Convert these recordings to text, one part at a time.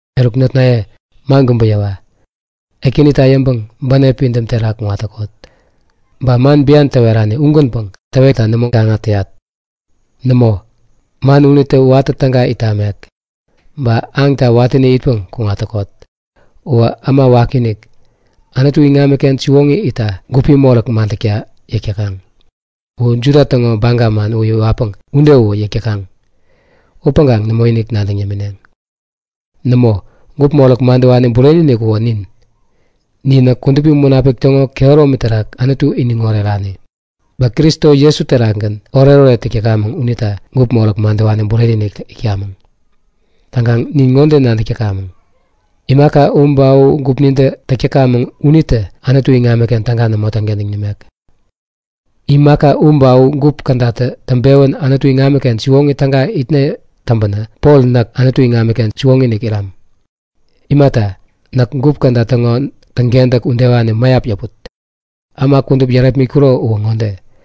Eruk notnaye, man kubä yäwa. Ekänita yäŋpäŋ bänep pidäm terak kuŋat täkot. Ba man bian täwerani ugänpäŋ täwetta nämo gaŋa täyat. Nämo, man unitä watä täga it tamek. Täŋkaŋ aŋta watäni itpeŋ kuŋat täkot! Uwä äma wakiinik, Anutu iŋamiken siwoŋi itta gupi moräk madäkta yäk täkaŋ. U Juda täŋo baga man u iwatpäŋ ude uwä yäk täkaŋ. Upäŋkaŋ nämoinik nadäŋ yämineŋ. Nämo! Gup moräk madäwani bureni-inik uwä nin. Ninä Kudupi Munapik täŋo kehäromi terak Anutu iniŋ orerani, ba Kristo Jesu terakgän oretoret täk täkamäŋ unita gup moräk madäwani bureni-inik itkamäŋ. Täŋkaŋ nin ŋode nadäk täkamäŋ; Imaka u ba u gupnintä täk täkamäŋ unitä Anutu iŋamiken täga nämo täŋkentäŋ nimek. Imaka u ba u gup kädatä täŋpewän Anutu iŋamiken siwoŋi täga itne täŋpänä Pol näk Anutu iŋamiken siwoŋi-inik iram. Imata, näk gup käda täŋo täŋkentäk udewani mäyap yäput, äma kudup yärepmitkuro uwä ŋode;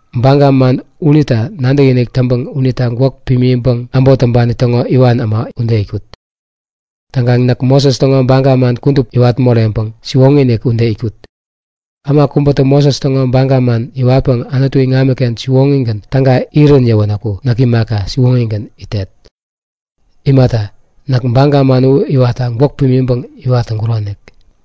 Baga man unita nadäkinik täŋpäŋ unita gwäk pimiŋpäŋ äbot täŋpani täŋo iwan äma ude itkut. Ba näk Moses täŋo baga man kudup iwat moreŋpäŋ siwoŋi-inik ude itkut. Äma kubätä Moses täŋo baga man iwatpäŋ Anutu iŋamiken siwoŋigän täga irän yäwänäku näk imaka, siwoŋigän itet. Imata, näk baga man u iwatta gwäk pimiŋpäŋ iwat täŋkuronik.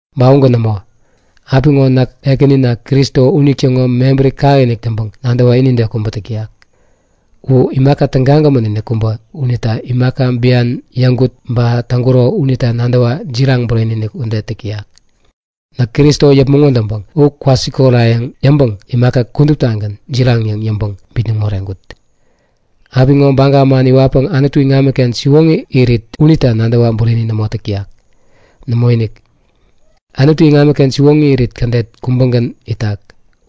Ba ugän nämo. Apiŋo näk Ekänina Kristo unitäŋo mebäri kakinik täŋpäŋ nadäwa inide kubä täk täyak. U imaka tägagämän-inik kubä unita imaka bian yäŋkut ba täŋkuro unita nadäwa jiraŋ bureni-inik ude täk täyak. Näk Kristo yäpmäŋ wädäŋpäŋ u kwasikorayäŋ yäŋpäŋ imaka kuduptagän jiraŋ yäŋ yäŋpäŋ bitnäŋ moreŋkut. Apiŋo baga man iwatpäŋ Anutu iŋamiken siwoŋi irit unita nadäwa bureni nämo täk täyak. Nämoinik! Anutu iŋamiken siwoŋi irit kädet kubägän itak,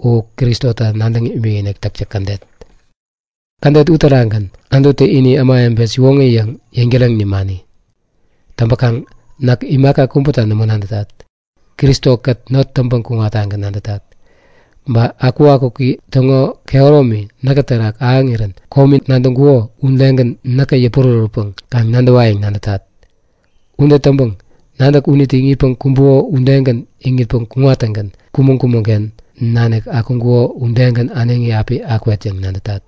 u Kristota nadäŋ imikinik täktäk kädet. Kädet uterakgän Anututä ini Ämawebe siwoŋi yäŋ yäŋtäreŋ nimani. Täŋpäkaŋ näk imaka kubäta nämo nadätat. Kristo-kät not täŋpäŋ kuŋattagän nadätat. Ba akukakuki täŋo kehäromi näkä terak ahäŋirän komi nadäŋkuko udegän näkä yäpurärätpäŋ kaŋ nadäwayäŋ nadätat. Ude täŋpäŋ nadäk unitä iŋitpäŋ kumbuko udegän iŋitpäŋ kuŋattäŋgän kumäŋ-kumäŋ-ken nanik akuŋkuko udegän äneŋi api akwet yäŋ nadätat.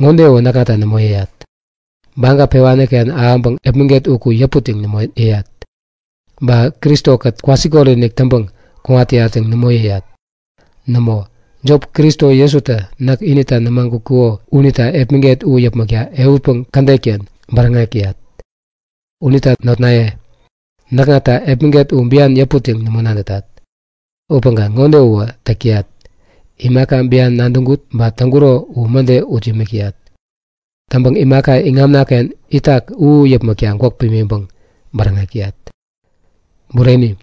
Ŋode uwä näkŋata nämo yäyat; Baga pewani-ken ahäŋpäŋ epmäget uku yäput yäŋ nämo yäyat, ba Kristo-kät kwasikot-inik täŋpäŋ kuŋat täyat yäŋ nämo yäyat. Nämo, jop Kristo Jesutä näk inita nämagutkuko unita epmäget u yäpmäkta ehutpäŋ kädet-ken bäräŋek täyat. Unita notnaye, näkŋata epmäget u bian yäput yäŋ nämo nadätat. Upäŋkaŋ ŋode uwä täk täyat; Imaka bian nadäŋkut ba täŋkuro u mäde ut yämik täyat. Täŋpäŋ imaka iŋamna-ken itak u yäpmäkta gwäk pimiŋpäŋ bäräŋek täyat. Bureni!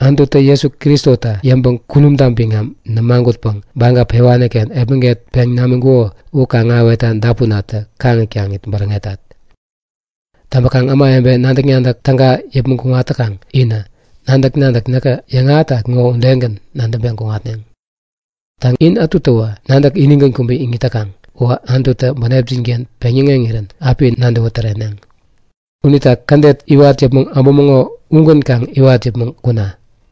Anututä Jesu Kristota yäŋpäŋ kunumta biŋam nämagutpäŋ baga pewani-ken epmäget peŋ namiŋkuko u kaŋ-ahäwetta dapunatä kaŋit-kaŋit bäräŋetat. Täŋpäkaŋ ämawebe nadäk-nadäk täga yäpmäŋ kuŋat täkaŋ inä, nadäk-nadäk näkä yäŋahätat ŋo udegän nadäŋpeŋ kuŋatne. Täŋ, in ätutäwä nadäk inigän kubä iŋit täkaŋ uwä Anututä bänepjin-ken peŋyäŋeŋirän api nadäwä täreneŋ. Unita kädet iwat yäpmäŋ äbumäŋo ugän kaŋ iwat yäpmäŋ kuna!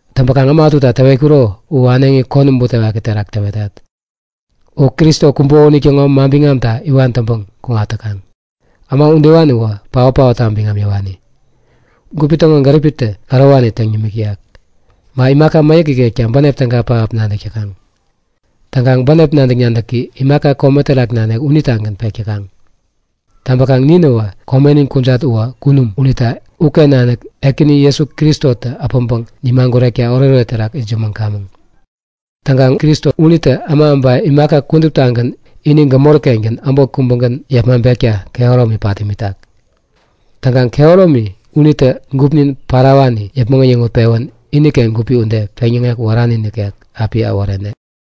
Täŋpäkaŋ äma ätuta täwetkuro u äneŋi konäm butewaki terak täwetat; U Kristo kumbuko unitäŋo manbiŋamta iwan täŋpäŋ kuŋat täkaŋ. Äma udewani uwä paot-paotta biŋam yäwani. Gupi täŋo gäriptä ärowani täŋ yämik täyak. Ba imaka mäyäk ikekta bänep täga pähap nadäk täkaŋ. Täŋkaŋ bänep nadäk-nadäki imaka kome terak nanik unitagän pek täkaŋ. Täŋpäkaŋ ninäwä komenin kujat uwä kunum unita uken nanik Ekäni Jesu Kristotä äpäŋpäŋ nimagurekta oretoret terak itsämäŋkamäŋ. Täŋkaŋ Kristo unitä äma ba imaka kuduptagän yäpmäŋ äpäŋpäŋ ini gämori-kengän äbot kubägän yepmaŋpekta kehäromi pat imitak. Täŋkaŋ kehäromi unitä gupnin parawani yäpmäŋ äyäŋutpewän iniken gupi ude, peŋyäŋek wärani nikek api äworene.